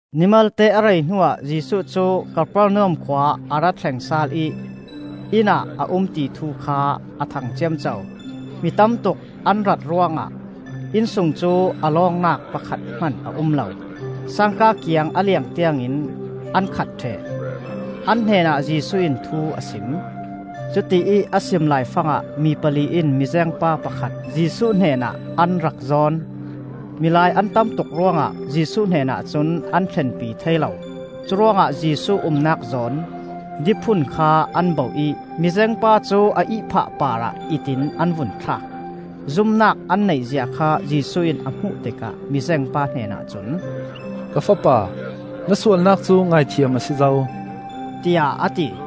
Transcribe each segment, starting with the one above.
Ni malte a rei hnuah Jesuh cu Kapernaum khua a ra thleng sal ih inn ah a um ti thu kha a thang ciamco. Mi tamtuk an rat ruangah inn sung cu a lawngnak pakhat hman a um lo; sangka kiang a leng tiangin an khat ṭheh. An hnenah Jesuh in thu a sim; cuti ih a sim laifangah mi pali in mizengpa pakhat Jesuh hnenah an rak zawn. Milai an tam tuk ruangah Jesuh hnenah cun an thlenpi thei lo. Curuangah Jesuh umnak zawn diphun kha an bauh ih mizengpa cu a ihphah parah it in an vun thlak. Zumnak an neih zia kha Jesuh in a hmuh tikah mizengpa hnenah cun, “Ka fapa, na sualnak cu ngaithiam a si zo,” tiah a ti.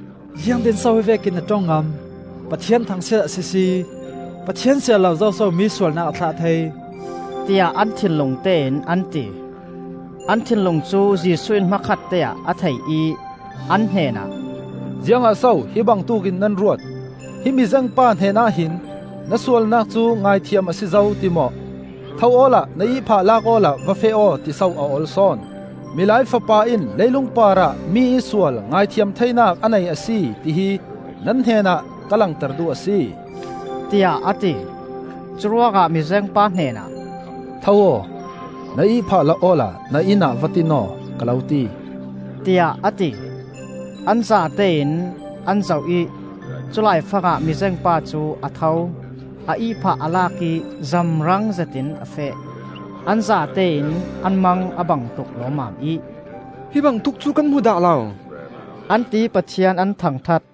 “Ziangtin so hi vekin a ṭong ngam? Pathian thangsiat a sisi. Pathian siar lo zoso mi sualnak a thlah thei?” tiah an thinlung tein an ti. An thinlung cu Jesuh in hmakhatte ah a thei ih an hnenah, “Ziangah so hi bangtuk in nan ruat? Hi mizengpa hnenah hin ‘Na sualnak cu ngaithiam a si zo,’ ti maw, ‘Tho awla na ihphah lak awla va feh aw,’ tiso a ol sawn? Milai Fapa in leilung parah mi ih sual ngaithiam theinak a nei a si, ti hi nan hnenah ka langter duh a si,” tiah a ti. Curuangah mizengpa hnenah, “Tho aw; na ihphah la awla na inn ah va tin aw, ka lo ti,” tiah a ti. An zatein an zoh ih cu laifangah mizengpa cu a tho; a ihphah a lak ih zamrang zetin a feh. An zatein an mang a bang tuk lawmmam ih “Hi bangtuk cu kan hmu dah lo,” an ti ih Pathian an thangṭhat.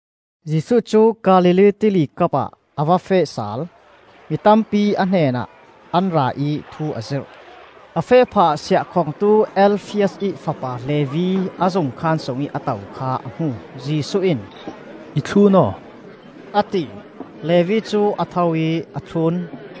Jesuh cu Galilee Tili kapah a va feh sal. Mi tampi a hnenah an ra ih thu a zirh. A feh phahah siahkhongtu, Alfias ih fapa Levi a zungkhaan sungih a to kha a hmu. Jesuh in, “I thlun aw,” a ti. Levi cu a tho ih a thlun.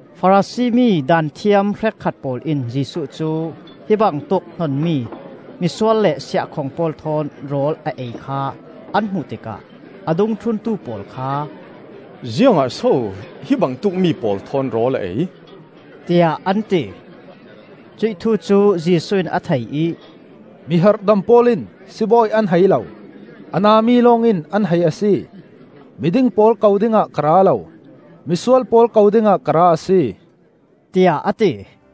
Farasi mi Daanthiam hrekkhat pawl in Jesuh cu hi bangtuk hnonmi misual le siahkhong pawl thawn rawl a ei kha an hmuh tikah a dungthluntu pawl kha, “Ziangah so hi bangtuk mi pawl thawn rawl a ei?” tiah an ti. Cuih thu cu Jesuh in a thei ih, “Mi harhdam pawl in sibawi an hai lo; a na mi lawng in an hai a si. Miding pawl ko dingah ka ra lo, misual pawl ko dingah ka ra a si,” tiah a ti.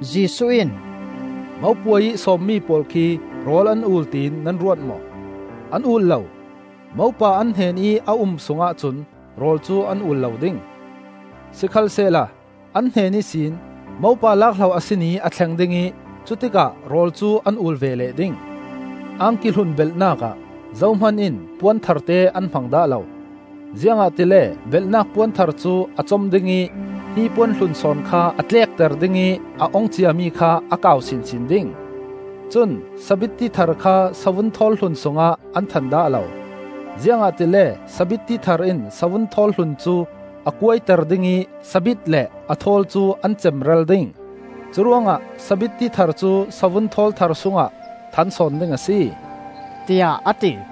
Jesuh in, “Mopuai ih sawmmi pawl khi rawl an ul tiin nan ruat maw? An ul lo! Mopa an hnenih a um sungah cun rawl cu an ul lo ding. Sikhalsehla an hnen ihsin mopa lak hlo a si ni a thleng ding ih cutikah rawl cu an ul ve leh ding. “Angki hlun belhnak ah zohman in puan tharte an hmang dah lo; ziangahtile belhnak puan thar cu a com ding ih hnipuan hlun sawn kha a tlekter ding ih a ong ciami kha a kau sinsin ding. Cun sabitti thar kha savun thawl hlun sungah an than dah lo, ziangahtile sabitti thar in savun thawl hlun cu a kuaiter ding ih sabit le a thawl cu an cemral ding. Curuangah sabitti thar cu savun thawl thar sungah than sawn ding a si,” tiah a ti.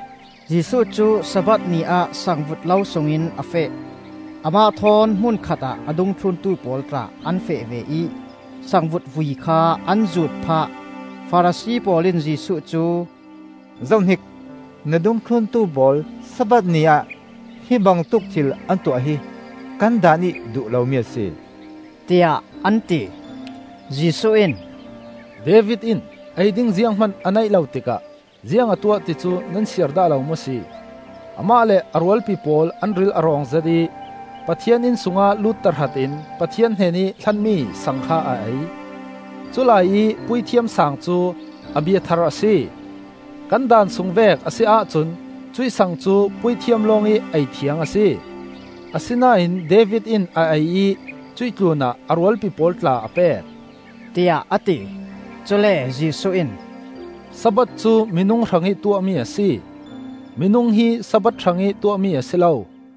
Jesuh cu Sabbath ni ah sangvut lo sungin a feh. Amah thawn hmun khatah a dungthluntu pawl tla an feh ve ih sangvut vui kha an zuut phah. Farasi pawl in Jesuh cu, “Zohhnik, na dungthlun pawl Sabbath ni ah hi bangtuk thil an tuah hi kan Daan ih duh lomi a si,” tiah an ti. Jesuh in, “David in ei ding zianghman a neih lo tikah ziang a tuah ti cu nan siar dah lo maw si? Amah le a rualpi pawl an ril a rawng zet ih, Pathian inn sungah lut tahratin Pathian hnenih hlanmi sang kha a ei. Culai ih Puithiam sang cu Abiathar a si. Kan Daan sung vek a si ahcun cuih sang cu puithiam lawngih eithiang a si. Asinain David in a ei ih cuih tlunah a rualpi pawl tla a pek,” tiah a ti. Cule Jesuh in, “Sabbath cu minung hrangih tuahmi a si; minung hi Sabbath hrangih tuahmi a si lo.